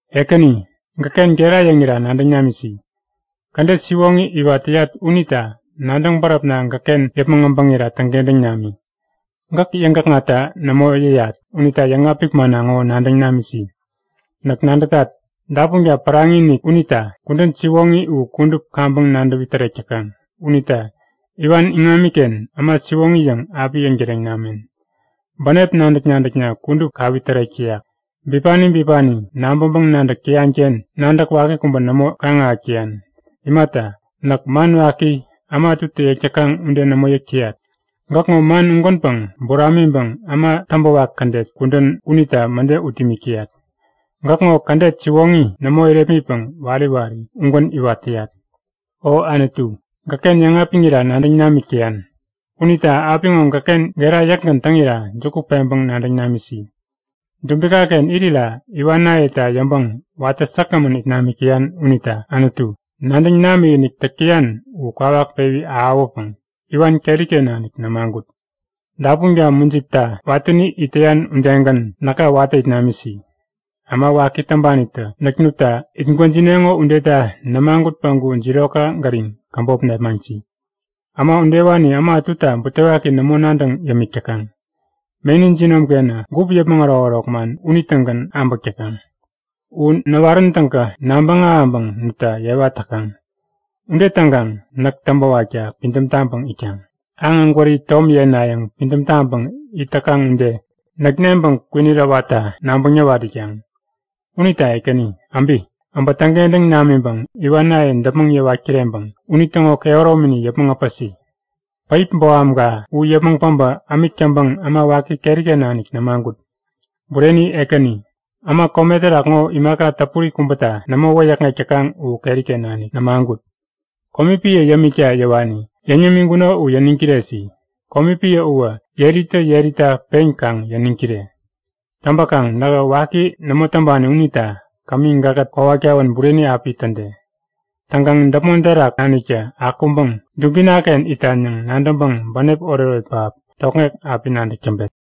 Ekäni, gäkken gera yäŋira nadäŋ namisi! Kädet siwoŋi iwat täyat unita nadäŋ bäräpna gäkken yäpmäŋ äbäŋira täŋkentäŋ nami. Gäk yäŋgäkŋatta nämo yäyat unita yäŋapik manna ŋo nadäŋ namisi. Näk nadätat, dapunka päraŋi-inik unita kudän siwoŋi u kudup kaŋpäŋ nadäwi tärek täkaŋ. Unita iwan iŋamiken äma siwoŋi yäŋ api yäŋtäreŋ namen. Bänep nadäk-nadäkna kudup kawi tärek täyak. Bipani bipani nabäŋpäŋ-nadäk täyanken nadäk waki kubä nämo kaŋ-ahäk täyan. Imata, näk man waki, äma ätutä yäk täkaŋ ude nämo yäk täyat. Gäkŋo man ugänpäŋ buramiŋpäŋ äma täŋpäwak kädet kudän unita mäde ut imik täyat. Gäkŋo kädet siwoŋi nämo irepmitpäŋ wari wari ugän iwat täyat. O Anutu, gäkken yäŋapiŋira nadäŋ namik täyan. Unita apiŋo gäkken gera yäkgän täŋira juku peŋpäŋ nadäŋ namisi. Dubikaken irira iwanayeta yäŋpäŋ watä säkgämän it namik täyan unita Anutu, nadäŋ namikinik täk täyan u kwawak pewi ahäwäpäŋ iwan keriken nanik nämagut. Dapunka mujipta watäni it täyan udegän näka watä it namisi. Äma waki täŋpanitä näk nutta itgwäjineŋo udeta nämagut päŋku jirokka gäriŋ käbop nepmaŋsi. Äma udewani äma ätuta butewaki nämo nadäŋ yämik täkaŋ. Meni jinomkenä gup yäpmäŋ ärokärok man unitägän abäk täkaŋ. U näwarän täŋkä nabäŋ ahäŋpäŋ nutta yewa täkaŋ. Ude täŋkaŋ näk täŋpäwakta pidäm taŋpäŋ itkaŋ. Aŋ ägwäri tom yenayäŋ pidäm taŋpäŋ it täkaŋ ude näk neŋpäŋ kwinit äwatta nabäŋ nawat itkaŋ. Unita Ekäni, äbi! Äbä täŋkentäŋ namiŋpäŋ iwanaye däpmäŋ yäwat kireŋpäŋ unitäŋo kehäromini yäpmäŋ äpäsi. Päip bohamka u yäpmäŋ päbä ämik täŋpäŋ äma waki keriken nanik nämagut. Bureni Ekäni, äma kome terak ŋo imaka täpuri kubäta nämo wäyäkŋek täkaŋ u keriken nanik nämagut. Komi piä yämikta yäwani yäŋ yämiŋkuno u yäniŋ kiresi. Komi piä uwä yeritä yerita pen kaŋ yäniŋ kire! Täŋpäkaŋ nähä waki nämo täŋpani unita kämi gäkkät kowat kawän bureni api täde. Täŋkaŋ däpmon terak naniktä akuŋpäŋ dubinaken itan yäŋ nadäŋpäŋ bänep oretoret pähap tokŋek api nadäk täŋpet.